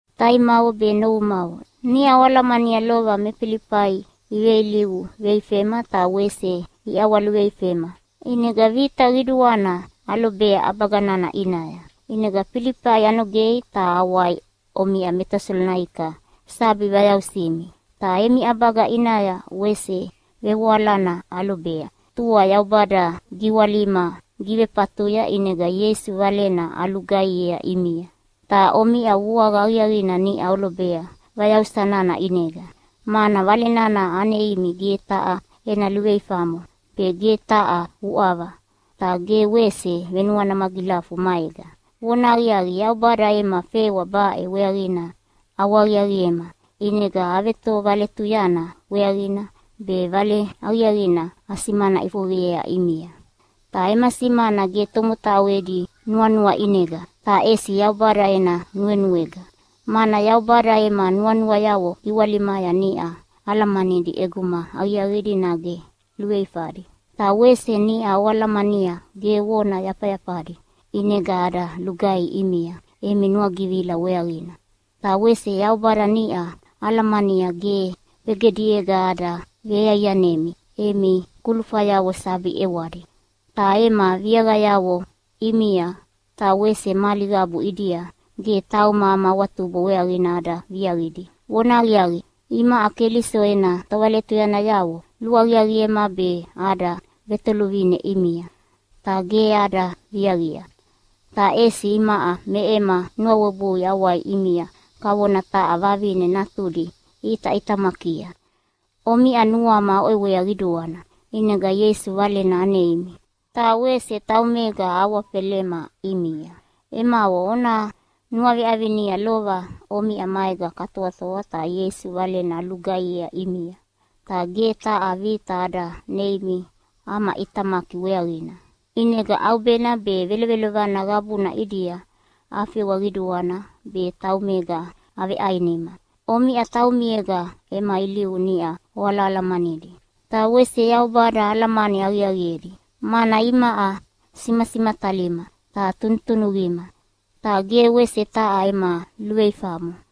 Taimavo be novumavo, niʼa oalamania lova me Filifai iveilivu veifema ta wese iʼawaluveifema, ʼinega vita qiduana alobea ʼabaga nana ʼinaya. ʼInega Filifai anogei ta awai omiʼa me Tesalonaika sabi vayausimi. Ta emi ʼabaga ʼinaya wese vevoalana alobea. Ta tua Yaubada giwalima givefatuya ʼinega Ieisu Valena alugaihiea ʼimia. Ta omiʼa vuaqa aqiaqina niʼa olobea vayausa nana ʼinega. Mana Vale nana aneimi ge taha ena luveifamo be ge taha uʼava ta ge wese venuana magilafu maega. Vonahaqiaqi, Yaubada ema fewa baʼe weaqina ʼawahaqiaqiema, ʼinega avetovaletuyana weaqina be Vale Aqiaqina asimana ʼifoqeyea ʼimia. Ta ema simana ge tomotau edi nuanua ʼinega, ta ʼesi Yaubada ena nuenuega. Mana Yaubada ema nuanuayavo giwalimaya niʼa alamanidi ʼeguma aqiaqidi nage luveifadi. Ta wese niʼa oalamania ge vona yafayafadi ʼinega ada lugaihi ʼimia emi nuagivila weaqina. Ta wese Yaubada niʼa alamania ge vegediega ada veiaianemi emi kulufayavo sabi ʼewadi. Ta ema viaqayavo ʼimia ta wese mali qabu ʼidia ge tauma ama awatubo weaqina ada viaqidi. Vonahaqiaqi, imaʼa Keliso ena tovaletuyanayavo luaqiaqiema be ada vetoluvine ʼimia, ta ge ada viaqia. Ta ʼesi imaʼa me ema nuawebui awai ʼimia kavona taha vavine natudi iʼitaʼitamakia. Omiʼa nuama oʼewea qiduana, ʼinega Ieisu Valena aneimi, ta wese taumega ahawafelema ʼimia. Emavo, ona nuaveʼavinia lova omiʼa maega katoatoa ta Ieisu Valena alugaihiea ʼimia. Ta ge taha vita ada neimi ama ʼitamaki weaqina, ʼinega ʼaubena be velovelovana qabuna ʼidia afewa qiduana be taumega aveʼainima. Omiʼa taumiega ema ilivu niʼa oalahalamanidi, ta wese Yaubada alamani aqiaqiedi, mana imaʼa simasimatalima ta tunutunuqima ta ge wese taha ema luveifamo.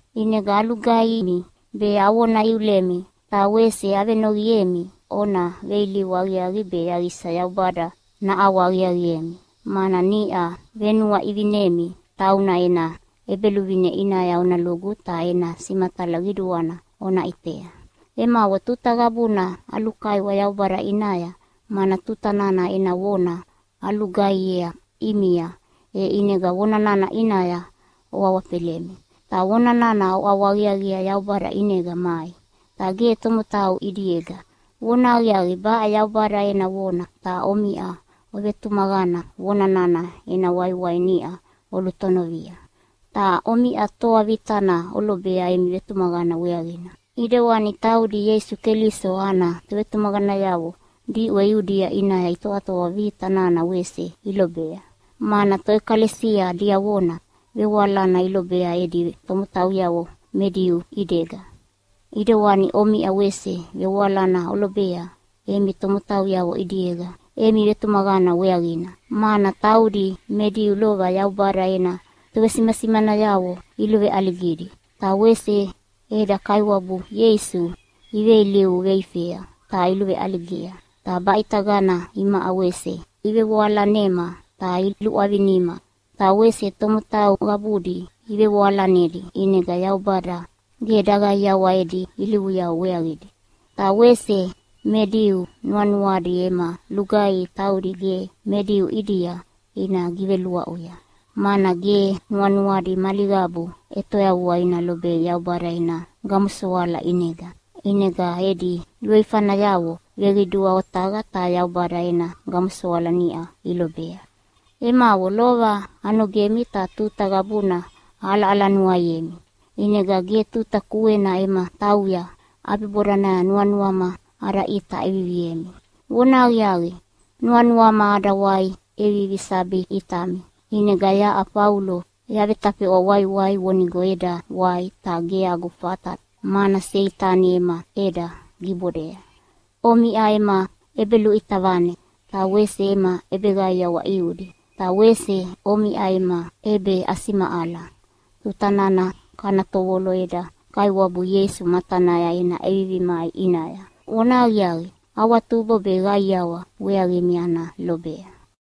ʼInega alugaihimi be avona iulemi ta wese avenoqiemi ona veilivu aqiaqi be yaqisa Yaubada naʼawahaqiaqiemi, mana niʼa venuaʼivinemi tauna ena ʼEbeluvine ʼinaya ona lugu ta ena simatala qiduana ona ʼitea. Emavo, tuta qabuna alulukaiwa Yaubada ʼinaya, mana tuta nana ena vona alugaihiea ʼimia e ʼinega vona nana ʼinaya oawafelemi. Ta vona nana oʼawahaqiaqiea Yaubada ʼinega mai, ta ge tomotau ʼidiega. Vonahaqiaqi, baʼe Yaubada ena vona, ta omiʼa tovetumaqana vona nana ena waiwai niʼa olutonovia. Ta omiʼa toa vitana olobea emi vetumaqana weaqina, ʼidewani taudi Ieisu Keliso ana tovetumaqanayavo diʼwe Iudia ʼinaya itoatoa vita nana wese ilobea. Mana toʼekalesia diavona vevoalana ilobea edi tomotauyavo me Diu ʼidega, ʼidewani omiʼa wese vevoalana olobea emi tomotauyavo ʼidiega emi vetumaqana weaqina. Mana taudi me Diu lova Yaubada ena tovesimanasimanayavo iluveʼaligidi, ta wese eda Kaiwabu Ieisu iveilivu veifea ta iluveʼaligia, ta baʼitagana imaʼa wese ivevoalanema ta iluʼwavinima. Ta wese tomotau qabudi ivevoalanedi ʼinega Yaubada ge daqaiawa edi ilivuyavo weaqidi. Ta wese me Diu nuanuadi ema lugaihi taudi ge me Diu ʼidia ina giveluaʼuya, mana ge nuanuadi mali qabu ʼetoyavua ina lobei Yaubada ena gamosoala ʼinega. ʼInega edi luveifanayavo veqidua otaqa ta Yaubada ena gamosoala niʼa ilobea. Emavo, lova anogemi ta tuta qabuna aʼalaʼalanuaiemi, ʼinega ge tuta kuena ema tauya ʼabibodanaya nuanuama ada ʼita ʼeviviemi. Vonahaqiaqi, nuanuama ada wai ʼevivi sabi ʼitami, ʼinega yaʼa Faulo yavetafeʼwa waiwai vonigo eda wai, ta ge agu fata mana Seitani ema ʼeda gibodea. Omiʼa ema ʼebeluʼita vane ta wese ema ʼebeqaiawa ʼiudi. Ta wese omiʼa ema ʼebeʼasimaʼala tuta nana kana tovolo eda Kaiwabu Ieisu matanaya ena ʼevivi mai ʼinaya. Vonahaqiaqi, awatubo be qaiawa weaqimi ana lobea.